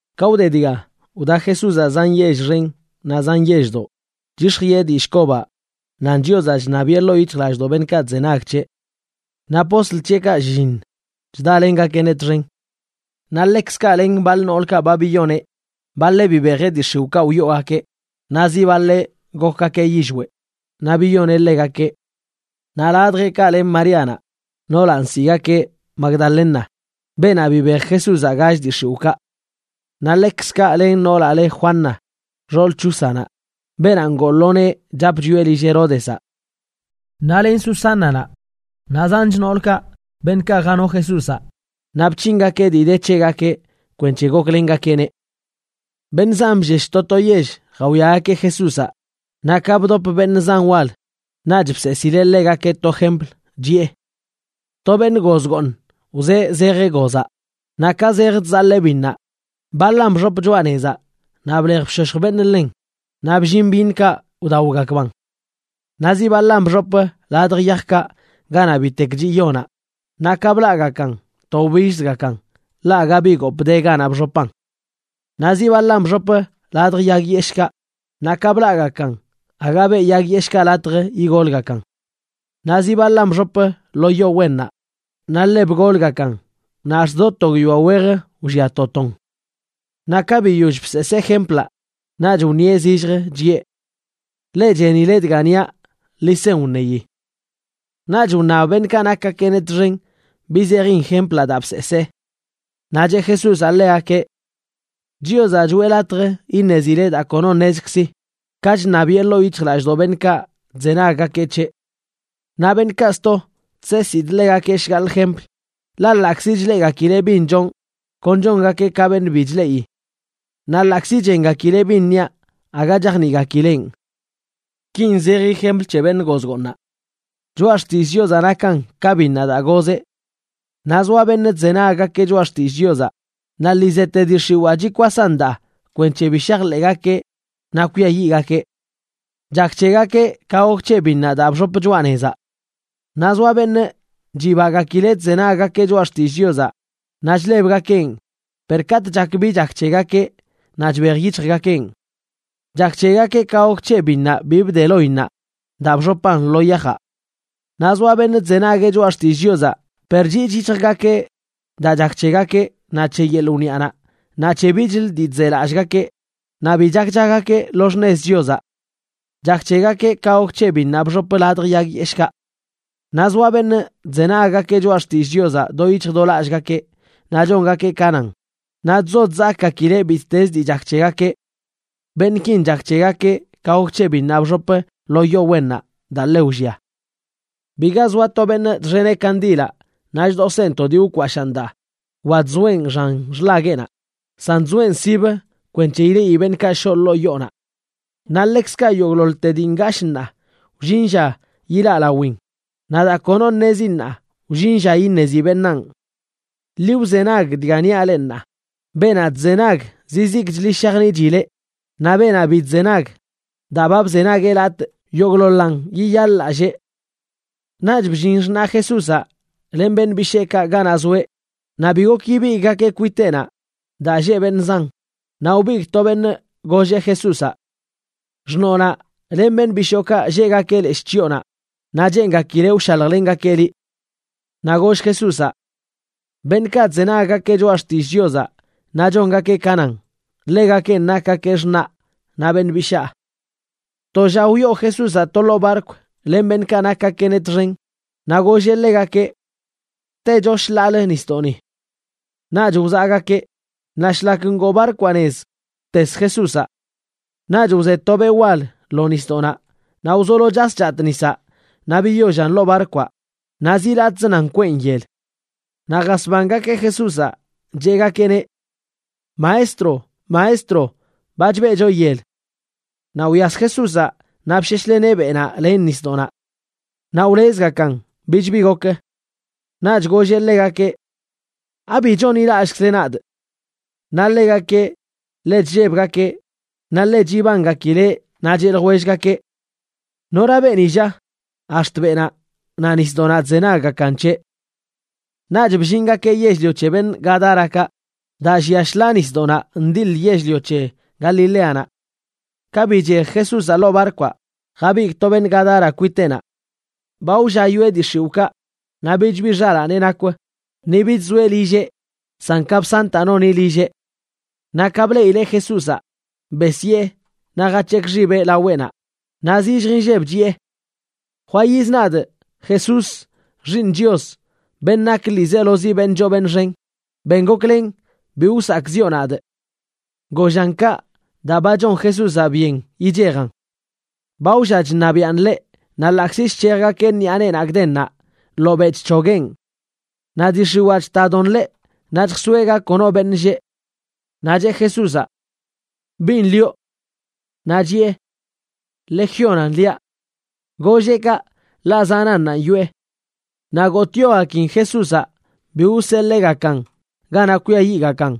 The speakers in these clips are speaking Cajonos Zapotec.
Ka wde dga, wda Jesúzaꞌ zan yell xen naꞌ zan yelldoꞌ, chyix̱jiꞌe dillꞌ kobaꞌ nan Chiozaꞌ chṉabiꞌe ḻoo yic̱hjlallꞌdoꞌ beṉꞌkaꞌ chzenag c̱heꞌ. Naꞌ postl c̱heꞌkaꞌ shlliṉ chdalengakeꞌneꞌ txen. Naꞌ ḻekzkaꞌ len baḻ noolkaꞌ ba biyoneꞌ. Baḻeꞌ bibejeꞌ dii x̱iwꞌkaꞌ wyoogakeꞌ, naꞌ zi baḻeꞌ gokgakeꞌ yillweꞌ naꞌ biyoneꞌ ḻegakeꞌ. Naꞌ ladjeꞌkaꞌ len Maríanaꞌ, noolaꞌ nsiꞌgakeꞌ Magdalena, beenaꞌ bibej Jesúzaꞌ gall dii x̱iwꞌkaꞌ. Naꞌ ḻekzkaꞌ len noolaꞌ le Juana, xool Chúzanaꞌ, beenaꞌ ngoo lo nee chap chwieꞌ lill Heródezaꞌ. Naꞌ len Susánanaꞌ, naꞌ zanch noolkaꞌ beṉꞌkaꞌ jano Jesúzaꞌ naꞌ bc̱hingakeꞌ dii de c̱hegakeꞌ kwenc̱he goklengakeꞌneꞌ. Beṉꞌ zan bllesh to to yell jawiagakeꞌ Jesúzaꞌ, naꞌ ka bdop beṉꞌ zan wal naꞌch bseesileꞌ ḻegakeꞌ to jempl, chiꞌe: ―To beṉꞌ goz gooṉ wzee zejeꞌ gozaꞌ. Naꞌ ka zej chzaḻee biṉnaꞌ, baḻan bxop choꞌa nezaꞌ naꞌ blej bshoshj beṉꞌ ḻen, naꞌ bllin byiṉkaꞌ wdaogakban. Naꞌ zi baḻan bxop ladj yajkaꞌ ganaꞌ bitek chiꞌ yonaꞌ, naꞌ ka blaꞌgakan to wbillzgakan, ḻaꞌ aga bi gopꞌ de ganaꞌ bxopan. Naꞌ zi baḻan bxop ladj yag yeshꞌkaꞌ, naꞌ ka blaꞌgakan aga beꞌ yag yeshꞌkaꞌ latj igolgakan. Naꞌ zi baḻan bxop lo yo wennaꞌ, naꞌ ḻe bgolgakan naꞌ ax̱t do to guiyoa wej wllia to ton. Naꞌ ka biyoll bseesee jemplaꞌ, naꞌch wṉieꞌ zilljə chiꞌe: ―Leꞌ chenile dga niaꞌ, ḻi sen wṉeyi. Naꞌch wṉab beṉꞌkaꞌ nakgakeꞌneꞌ txen bi zejin jemplaꞌ daa bseesee. Naꞌ cheꞌ Jesúzaꞌ ḻegakeꞌ: ―Chiozaꞌ choꞌe latj iṉezile daa kono ṉezkzi, ka chṉabiꞌe ḻoo yic̱hjlallꞌdoꞌ beṉꞌkaꞌ chzenaggakeꞌ c̱heꞌ. Naꞌ beṉꞌkaꞌ sto chseesidꞌ ḻegakeꞌ shgaḻꞌ jempl, ḻaꞌ ḻaꞌkzi chleꞌgakileꞌ bin chonꞌ, kon chongakeꞌ ka beṉꞌ bi chleꞌi. Naꞌ ḻaꞌkzi chengakileꞌ bin niaꞌ, aga chajniꞌgakileꞌn. ’Kin zeji jempl c̱he beṉ goz gooṉaꞌ: choꞌa xtillꞌ Chiozaꞌ nakan ka biṉnaꞌ daa gozeꞌ. Naꞌ zoa beṉꞌ chzenaggakeꞌ choꞌa xtillꞌ Chiozaꞌ, naꞌ lii zeꞌte dii x̱iwaa chikwasan daa kwenc̱he bi shajḻeꞌgakeꞌ naꞌ kwiayiꞌgakeꞌ. Chak c̱hegakeꞌ ka gok c̱he biṉnaꞌ daa bxop choꞌa nezaꞌ. Naꞌ zoa beṉꞌ chibagakileꞌ chzenaggakeꞌ choꞌa xtillꞌ Chiozaꞌ naꞌ chlebgakeꞌn, per katꞌ chak bi chak c̱hegakeꞌ naꞌ chbej yic̱hjgakeꞌn. Chak c̱hegakeꞌ ka gok c̱he biṉnaꞌ bi bde loinnaꞌ daa bxopan lo yajaꞌ. Naꞌ zoa beṉꞌ chzenagueꞌ choꞌa xtillꞌ Chiozaꞌ, per chiꞌch yic̱hjgakeꞌ daa chak c̱hegakeꞌ naꞌ c̱he yeḻꞌ wniꞌanaꞌ, naꞌ c̱he bichlə dii chzelallꞌgakeꞌ, naꞌ bi chakchagakeꞌ lo xṉez Chiozaꞌ. Chak c̱hegakeꞌ ka gok c̱he biṉnaꞌ bxop ladj yag yeshꞌkaꞌ. Naꞌ zoa beṉꞌ chzenaggakeꞌ choꞌa xtillꞌ Chiozaꞌ do yic̱hj do lallꞌgakeꞌ naꞌ chongakeꞌ ka nan, naꞌ chzo chzakgakileꞌ bittezə dii chak c̱hegakeꞌ. Beṉꞌkin chak c̱hegakeꞌ ka gok c̱he biṉnaꞌ bxop lo yo wennaꞌ daa ḻe wllia. ’Biga zoa to beṉꞌ chxeneꞌ kandilaꞌ naꞌ chdoseꞌn to dii wkwashaan daa wa chzoeꞌn xan xḻagueꞌnaꞌ, san chzoeꞌn sibə kwenc̱he ileꞌi beṉꞌkaꞌ shoꞌ ḻoo yoonaꞌ. Naꞌ ḻekzkaꞌ yogꞌḻoḻte dii ngashꞌ ṉaa, wllin lla yilaꞌ lawin, naꞌ daa kono ṉezi ṉaa, wllin lla iṉezi beṉaan. ’Ḻi wzenag dga niaꞌ leꞌ ṉaa. Beenaꞌ chzenag zizikchli shajniꞌchileꞌ, naꞌ beenaꞌ bi chzenag, daa ba bzenagueꞌ latꞌ, yogꞌḻoḻan yiyaḻ-lallee. Naꞌch bllin xṉaꞌ Jesúzaꞌ len beṉꞌ bisheekaꞌ ganaꞌ zoeꞌ, naꞌ bi gok ibigꞌgakeꞌ kwiteꞌnaꞌ daa lleꞌ beṉꞌ zan. Naꞌ wbigꞌ to beṉꞌ golleꞌ Jesúzaꞌ: ―Xṉoonaꞌ len beṉꞌ bishookaꞌ lleꞌgakeꞌ leshꞌ chyoonaꞌ naꞌ cheengakileꞌ wshaljlengakeꞌ liꞌ. Naꞌ goll Jesúzaꞌ: ―Beṉꞌkaꞌ chzenaggakeꞌ choꞌa xtillꞌ Chiozaꞌ naꞌ chongakeꞌ ka nan, ḻegakenꞌ nakgakeꞌ xṉaꞌ naꞌ beṉꞌ bishaa. To lla wyoo Jesúzaꞌ to ḻoo barkw len beṉꞌkaꞌ nakgakeꞌneꞌ txen naꞌ golleꞌ ḻegakeꞌ: ―Techo shḻaalə nisdoꞌni. Naꞌch wzaꞌgakeꞌ. Naꞌ shlak ngoo barkwaꞌ nez, wtes Jesúzaꞌ. Naꞌch wze to beꞌ wal lo nisdoꞌnaꞌ naꞌ wzolo chas chatꞌ nisaꞌ naꞌ biyollan ḻoo barkwaꞌ, naꞌ zi latꞌzə nan kweꞌn yel. Naꞌ jasbangakeꞌ Jesúzaꞌ, cheꞌgakeꞌneꞌ: ―¡Maestro! ¡Maestro! ¡Ba chbeꞌcho yel! Naꞌ wyas Jesúzaꞌ naꞌ bsheshleneꞌ beꞌnaꞌ len nisdoꞌnaꞌ. Naꞌ wlezgakan, bich bi gok. Naꞌch golleꞌ ḻegakeꞌ: ―¿Abi chonḻilallꞌkzle nadꞌ? Naꞌ ḻegakeꞌ ḻe chllebgakeꞌ naꞌ ḻe chibangakileꞌ naꞌ cheꞌ ljwellgakeꞌ: ―¿Nora beeni lla?, ax̱t beꞌnaꞌ naꞌ nisdoꞌnaꞌ chzenaggakan c̱heꞌ. Naꞌch bllingakeꞌ yell-lio c̱he beṉꞌ Gadárakaꞌ, daa llia shḻaa nisdoꞌnaꞌ ndiḻ yell-lio c̱he Galileanaꞌ. Ka bichej Jesúzaꞌ ḻoo barkwaꞌ jabigꞌ to beṉꞌ Gadara kwiteꞌnaꞌ. Ba wlla yoꞌe dii x̱iwꞌkaꞌ, naꞌ bich bi xalaaneꞌ nakw, ni bich zoeꞌ lilleꞌ, san kapsantaꞌ noni lilleꞌ. Naꞌ ka bleꞌileꞌ Jesúzaꞌ, besyee naꞌ jac̱hekꞌ xibeꞌ laweꞌnaꞌ, naꞌ zillj inlleb chiꞌe: ―Jwayiz nadꞌ, Jesús Xiiṉ Chios, beṉꞌ nak ḻiizelozi beṉꞌ choo beṉꞌ xen. Ben goklen bi wsakꞌziꞌo nadꞌ. Gollan kaꞌ daa ba chon Jesúzaꞌ byen yichejan. Ba wlla chṉabiꞌan ḻeꞌ naꞌ ḻaꞌkzi chc̱hejgakeꞌ ṉiꞌa neenaꞌ gdennaꞌ, ḻobeꞌ chc̱hogueꞌn. Naꞌ dii x̱iwaa chtadon ḻeꞌ naꞌ chjsoeꞌ ga kono beṉꞌ lleꞌ. Naꞌ cheꞌ Jesúzaꞌ: ―¿Bin lioꞌ? Naꞌ chiꞌe: ―Legiónan liaꞌ. Golleꞌ kaꞌ, ḻaꞌ zanannanꞌ yoꞌe. Naꞌ gotꞌyogakin Jesúzaꞌ bi wseḻeegakan ganaꞌ kwiayiꞌgakan.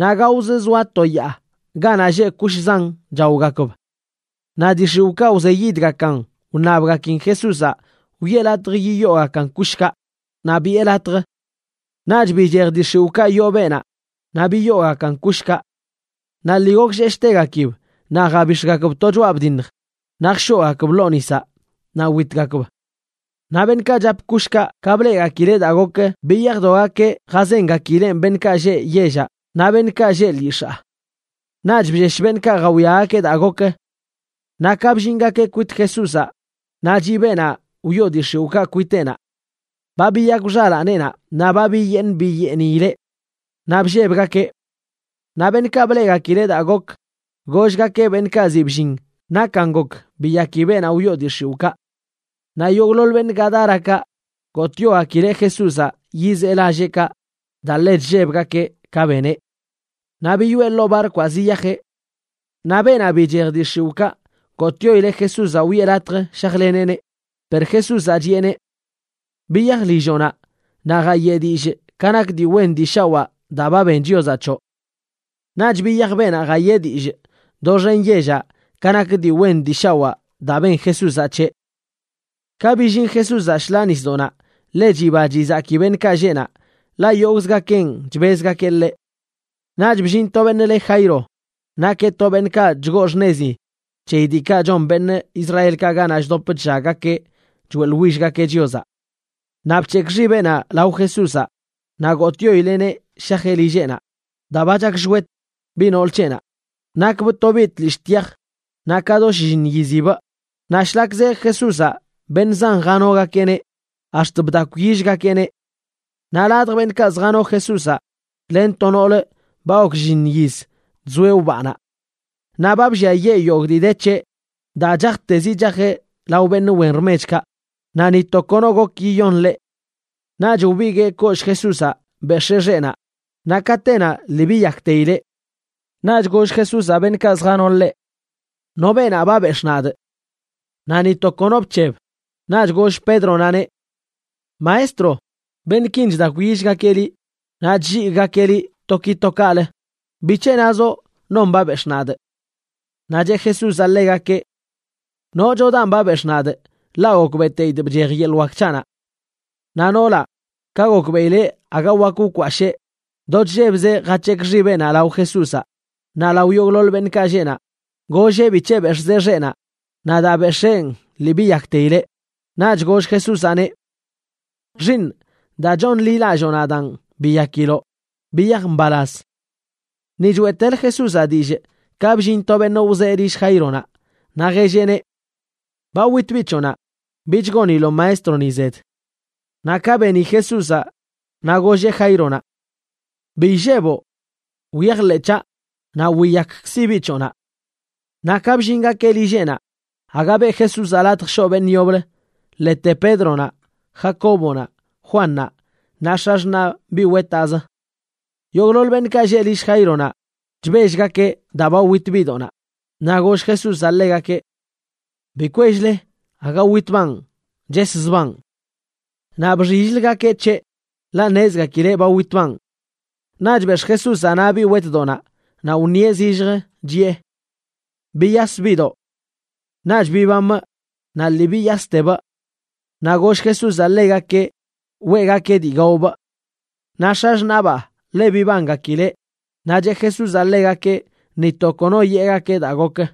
Naꞌ gaozə zoa to yaa ganaꞌ lleꞌ kush zan chaogakb. Naꞌ dii x̱iwꞌkaꞌ wzeyidgakan wṉabgakin Jesúzaꞌ wiꞌe latj yiyoogakan kushkaꞌ, naꞌ biꞌe latj. Naꞌch bichej dii x̱iwꞌkaꞌ yoo beenaꞌ naꞌ biyoogakan kushkaꞌ. Naꞌ lii goklleshtegakib naꞌ jabix̱gakb to choꞌa bdiṉj naꞌ jshoogakb ḻoo nisaꞌ naꞌ witgakb. Naꞌ beṉꞌkaꞌ chap kushkaꞌ ka bleꞌgakileꞌ daa gok, biyajdogakeꞌ jazengakileꞌn beṉꞌkaꞌ lleꞌ yellaꞌ naꞌ beṉꞌkaꞌ lleꞌ lyix̱aa. Naꞌch bllesh beṉꞌkaꞌ jawiagakeꞌ daa gok. Naꞌ ka bllingakeꞌ kwit Jesúzaꞌ, naꞌ chiꞌ beenaꞌ wyoo dii x̱iwꞌkaꞌ kwiteꞌnaꞌ. Ba biyakw xalaaneꞌnaꞌ naꞌ ba biyeeṉ biyeeniileꞌ. Naꞌ bllebgakeꞌ. Naꞌ beṉꞌkaꞌ bleꞌgakileꞌ daa gok, gollgakeꞌ beṉꞌkaꞌ ziꞌ bllin nakan gok biyaki beenaꞌ wyoo dii x̱iwꞌkaꞌ. Naꞌ yogꞌḻoḻ beṉꞌ Gadárakaꞌ gotꞌyogakileꞌ Jesúzaꞌ yizee lalleꞌkaꞌ daa ḻe chllebgakeꞌ ka beneꞌ. Naꞌ biyoꞌe ḻoo barkwaꞌ ziyajeꞌ. Naꞌ beenaꞌ bichej dii x̱iwꞌkaꞌ gotꞌyoileꞌ Jesúzaꞌ wiꞌe latj shajleneꞌneꞌ. Per Jesúzaꞌ chiꞌeneꞌ: ―Biyaj lilloꞌnaꞌ naꞌ jayeꞌ dillꞌ ka nak dii wen dii shawaa daa ba ben Chiozaꞌ c̱hoꞌ. Naꞌch biyaj beenaꞌ jayee dillꞌ doxen yellaꞌ ka nak dii wen dii shawaa daa ben Jesúzaꞌ c̱heꞌ. Ka billin Jesúzaꞌ shḻaa nisdoꞌnaꞌ, ḻe chiba chizaki beṉꞌkaꞌ lleꞌ naꞌ, ḻaꞌ yogꞌzgakeꞌn chbezgakeꞌ ḻeꞌ. Naꞌch bllin to beṉꞌ le Jairo, nakeꞌ to beṉꞌkaꞌ chgoo xṉezi c̱heyi diikaꞌ chon beṉꞌ Israelkaꞌ ganaꞌ chdop chllaggakeꞌ choeꞌḻwillgakeꞌ Chiozaꞌ. Naꞌ bc̱hekꞌ xibeꞌnaꞌ lao Jesúzaꞌ naꞌ gotꞌyoileꞌneꞌ shajeꞌ lilleꞌnaꞌ, daa ba chakshwet biꞌ nool c̱heꞌnaꞌ. Nakbꞌ to biꞌ tlishꞌ tyaj, naꞌ ka do shlliṉ yizibꞌ. Naꞌ shlak zej Jesúzaꞌ beṉꞌ zan janogakeꞌneꞌ ax̱t bdakwyillgakeꞌneꞌ. Naꞌ ladj beṉꞌkaꞌ zjano Jesúzaꞌ len to noolə ba gok shlliṉ yiz chzoeꞌ wbaanaꞌ. Naꞌ ba blliayee yogꞌ dii de c̱heꞌ daa chajtezi chajeꞌ lao beṉꞌ wen rmechkaꞌ, naꞌ ni to kono gok yiyon ḻeꞌ. Naꞌch wbiguee kollꞌ Jesúzaꞌ bex̱ee xeꞌnaꞌ, naꞌ katenaꞌ lii biyakteileꞌ. Naꞌch goll Jesúzaꞌ beṉꞌkaꞌ zjano ḻeꞌ: ―¿No beenaꞌ ba bex̱ꞌ nadꞌ? Naꞌ ni to kono bc̱heb. Naꞌch goll Pédronaꞌneꞌ: ―Maestro, beṉꞌkin chdakwyillgakeꞌ liꞌ naꞌ chlligꞌgakeꞌ liꞌ to ki to kaꞌlə. ¿Bic̱he nazoꞌ: “Non ba bex̱ꞌ nadꞌ”? Naꞌ cheꞌ Jesúzaꞌ ḻegakeꞌ: ―Nochodanꞌ ba bex̱ꞌ nadꞌ, ḻaꞌ gokbeꞌteidꞌ bchej yeḻꞌ wak c̱haꞌnaꞌ. Naꞌ noolaꞌ, ka gokbeꞌileꞌ aga wak wkwashee, do chllebzeꞌ jac̱hekꞌ xibeꞌnaꞌ lao Jesúzaꞌ. Naꞌ lao yogꞌḻoḻ beṉꞌkaꞌ lleꞌ naꞌ, golleꞌ bic̱he bex̱ꞌzeꞌ xeꞌnaꞌ naꞌ daa bex̱een lii biyakteileꞌ. Naꞌch goll Jesúzaꞌneꞌ: ―Xiiṉꞌ, daa chonḻilalloo nadaan biyakiloꞌ. Biyaj mbalaz. Ni choeꞌtelə Jesúzaꞌ dillꞌ ka bllin to beṉꞌ wzee lill Jaironaꞌ, naꞌ jelleꞌneꞌ: ―Ba wit biꞌ c̱hoꞌnaꞌ. Bich goniloꞌ Maestroni zed. Naꞌ ka beni Jesúzaꞌ, naꞌ golleꞌ Jaironaꞌ: ―Bi illeboꞌ. Wyajḻeꞌ c̱haꞌ, naꞌ wiyakkzi biꞌ c̱hoꞌnaꞌ. Naꞌ ka bllingakeꞌ lilleꞌnaꞌ, aga beꞌ Jesúzaꞌ latj shoꞌ beṉꞌ yoblə, ḻete Pédronaꞌ, Jacóbonaꞌ, Juannaꞌ naꞌ x̱axṉaꞌ biꞌ wetaꞌzə. Yogꞌḻoḻ beṉꞌkaꞌ lleꞌ lill Jaironaꞌ chbellgakeꞌ daa ba wit biꞌdoꞌnaꞌ. Naꞌ goll Jesúzaꞌ ḻegakeꞌ: ―Bi kwell-le, aga witbaan, cheszbaan. Naꞌ bxill-ləgakeꞌ c̱heꞌ, ḻaꞌ ṉezgakileꞌ ba witbaan. Naꞌch bex̱ꞌ Jesúzaꞌ naꞌ biꞌ wetdoꞌnaꞌ naꞌ wṉieꞌ zilljə, chiꞌe: ―Biyas, biꞌdoꞌ. Naꞌch bibamꞌ naꞌ lii biyastebꞌ. Naꞌ goll Jesúzaꞌ ḻegakeꞌ weꞌgakeꞌ dii gaobꞌ. Naꞌ x̱axṉaꞌbaa ḻe bibangakileꞌ, naꞌ cheꞌ Jesúzaꞌ ḻegakeꞌ ni to kono yeꞌgakeꞌ daa gok.